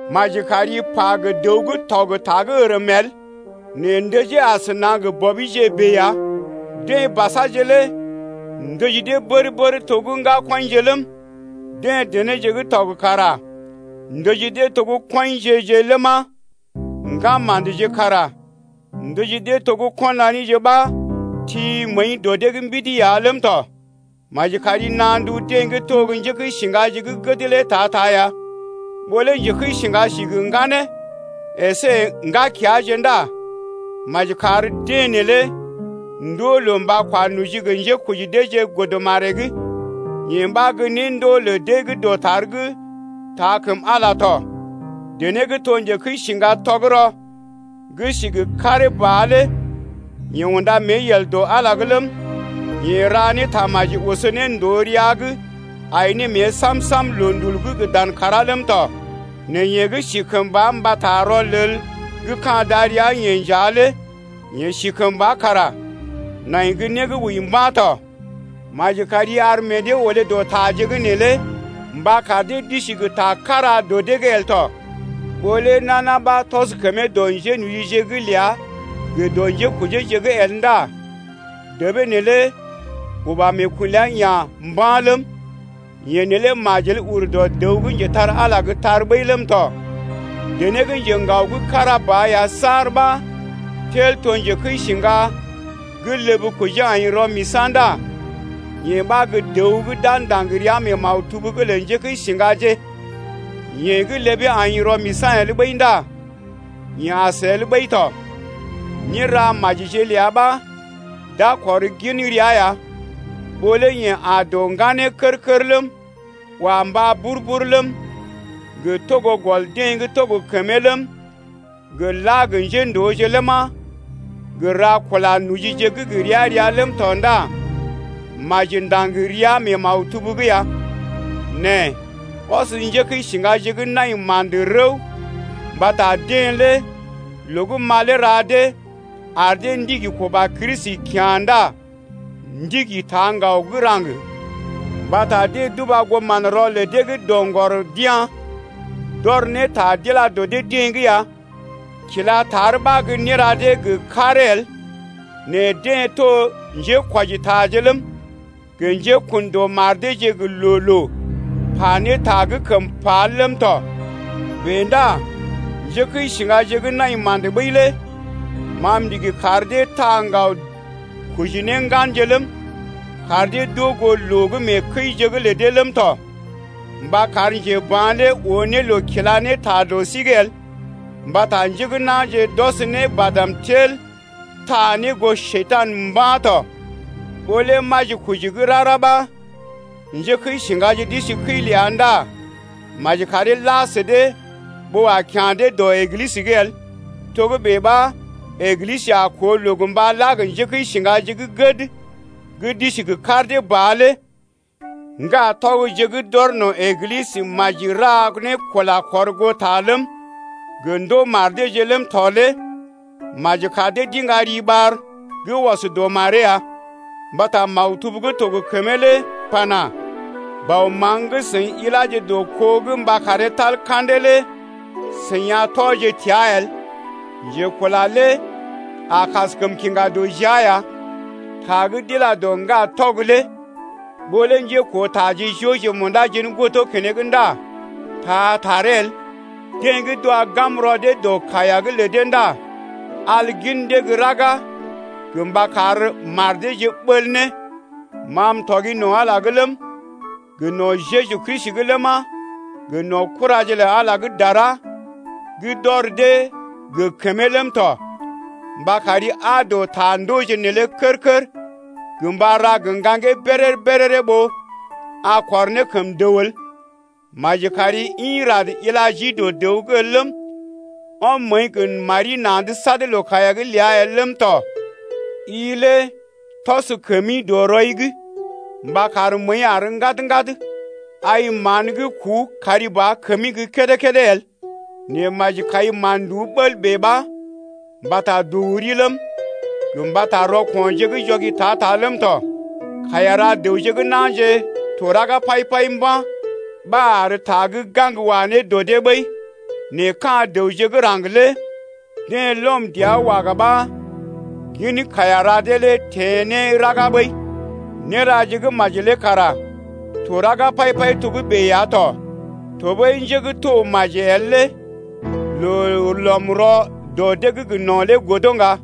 Maji kari pa gə dəw gə́ tɔg ta gə́ ərm el nɛ ndəjee asəna gə bɔbije bèe ya, deḛ basaje lé ndəji dee bər-bər to gə́ ŋgakɔḭje ləm, deḛ denéje gə́ tɔg kara ndəji dee to gə́ kɔinje-je ləma, ŋgama̰dje kara ndəji dee to gə́ ko̰ nanije ɓa ti məəi dɔ dee’g mbidi ya ləm tɔ. Maji kari naa ndu deḛ gə́ to gə́ njékəisiŋgaje gə́ gəd lé ta-ta ya. Ɓó lé njekəisiŋga si gə ŋganee əsé ŋgakeaje ndá maji kar deḛ neelé ndoo loo mba kwa noji gə njékoji deeje godə maree’g. Yee ɓa gə́ néndoo lə deḛ gə́ dɔtar gə́ taa kəm Ala lé tɔ. Dené gə́ to njekəisiŋga tɔgərɔ gə́ si gə karee ba lé yeḛ unda mée yel dɔ Ala’g ləm, yeḛ ra ne tamaji oso ne ndòo rəa’g ai ne mée sam-sam loondul’g gə dan kàrá ləm tɔ. Nɛ yeḛ gə́ si mbata rɔlel gə́ ka̰ darəa-yeḛ nja lé yeḛ si kəmba kara nai gə́ né gə́ wəi mba̰ tɔ. Maji kari ar meḛ dee olé dɔ taje’g neelé mba kar dee d’isi gə ta kára dɔ dee’g el tɔ. Ɓó lé nana ɓa tɔs kəmee dɔ njénojije’g ləa gə dɔ njékojeeje’g el ndá debee neelé uba meekun ləa ya̰ mba̰ ləm, yeḛ neelé majel ur dɔ dəw gə́ njetar-Ala’g gə́ tar ɓəi ləm tɔ. Dené gə́ njeŋgao gə́ kára ba ya saar ɓa tel to njekəisiŋga gə́ ləb kojee aḭ rɔ-misa̰ ndá yee ɓa gə́ dəw gə́ d’a ndaŋg ria mee maktub’g lə njékəisiŋgaje, yeḛ gə́ ləbee aḭ rɔ-misa̰ el ɓəi ndá yeḛ as el ɓəi tɔ. Néra majije ləa ɓa d’a kɔr gin rəa ya, ɓó lé yeḛ aa dɔ ŋganeeje kər-kər ləm, wa mbá bur-bur ləm, gə togo gɔl deḛ gə́ to gə kəmee ləm, gə la gə njéndooje ləma, gə ra kula nojije gə́ gə ria-ria ləm tɔ ndá maji ndaŋg ria mee maktub’g ya. Nɛ ɔs njékəisiŋgaje gə́ nai ma̰də lé rəw mbata deḛ lé loo gə́ malee ra dee ar dee ndigi kuba Kristi kyá̰ ndá ndigi taa ŋgaw gə́ raŋg. Yee ɓa deḛ d’uba goo manrɔ lə deḛ gə́ doŋgɔr d’ya̰, d’ɔr ne ta d’ila dɔ dee-deḛ’g ya. Kila tar ɓa gə́ néra dee gə karee el, nɛ deḛ to njékwɔjitaje ləm, gə njékun dɔ mar deeje gə loo-loo pa ne ta gə́ kəm pa el ləm tɔ. Bèe ndá njékəisiŋgaje gə́ nai ma̰də ɓəi lé ma m’ndigi kar dee taa ŋgaw koji ne ŋganje ləm, kar dee d’oo goo loo gə́ mee kəije’g lə dee ləm tɔ, mba kar njeba̰ lé oo ne loo kila ne ta dɔ sí’g el. Mbata njé gə́ na̰je d’ɔs ne badm tel taa ne goo Njekurai mba̰ tɔ. Ɓó lé majikoji gə́ rara ɓa njékəisiŋgaje d’isi kəi ləa ndá maji karee la sə dee ɓó a kya̰ dee dɔ Eglisə’g el, togə́bè ɓa Eglisə a koo loo gə mba la gə njékəisiŋgaje gə́ gəd gə́ d’isi gə kar dee ba lé. Ŋgatɔgje gə́ d’ɔr no̰ Eglisə maji ra ne kula kɔrgoota ləm, gə ndoo mar deeje ləm tɔ lé maji kar dee d’iŋga riɓar gə́ ɔs dɔ maree ya. Mbata maktub gə́ to gə kəmee lé pana: Bɔ maŋg gə́ i ila dɔ kó’g mba karee tal ka̰dee lé i a tɔ təa el. Njekula lé a kaskəm kiŋga dɔ jia ya. Ta gə́ d’ila dɔ ŋgatɔg lé ɓó lé njékootaje jooje munda jen godo keneŋ ndá taa taree el. Deḛ gə́ d’wa gam rɔ dee dɔ kaiya’g lə dee ndá al gin dee gə́ raga gə mba kar mar deeje ɓəl ne. Ma m’tɔgi no̰ Ala’g ləm, gə no̰ Jeju Kristi’g ləma, gə no̰ kuraje lə Ala gə́ dara gə́ d’ɔr dee gə kəmee ləm tɔ mba kari aa dɔ ta ndooje neelé kər-kər gə mba ra gə ŋgaŋgee béréré-béréré ɓó a kɔr ne kəm dəw el. Maji kari ḭ rad ila jii dɔ dəw’g el ləm, ɔm məəi gə mari na̰’d sad loo-kaiya’g ləa el ləm tɔ, i lé tɔs kəmi dɔ rɔi’g mba kar məəi àr ŋgad-ŋgad. Ai mán gə́ kuu kari ba kəmi gə́ kédé-kédé el, nɛ maji kai mán-nduú bəl bèe ɓa mbata dɔ wuri ləm, gə mbata rɔko̰je gə́ jɔgi ta-ta ləm tɔ. Kaiya ra dəwje gə́ na̰je to raga pai-pai mba̰ ɓa ar ta gə́ gaŋg wa ne dɔ dee ɓəi, nɛ ɓee lə dəwje gə́ raŋg lé deḛ lɔm dɔ’g waga ɓa gin kaiya ra dee lé teḛ ne raga ɓəi. Néraje gə́ maji lé kara to raga pai-pai togə́bè ya to tɔɓəi njé gə́ to maji el lé loo lɔm rɔ dɔ dee’g no̰ lé godo ŋga.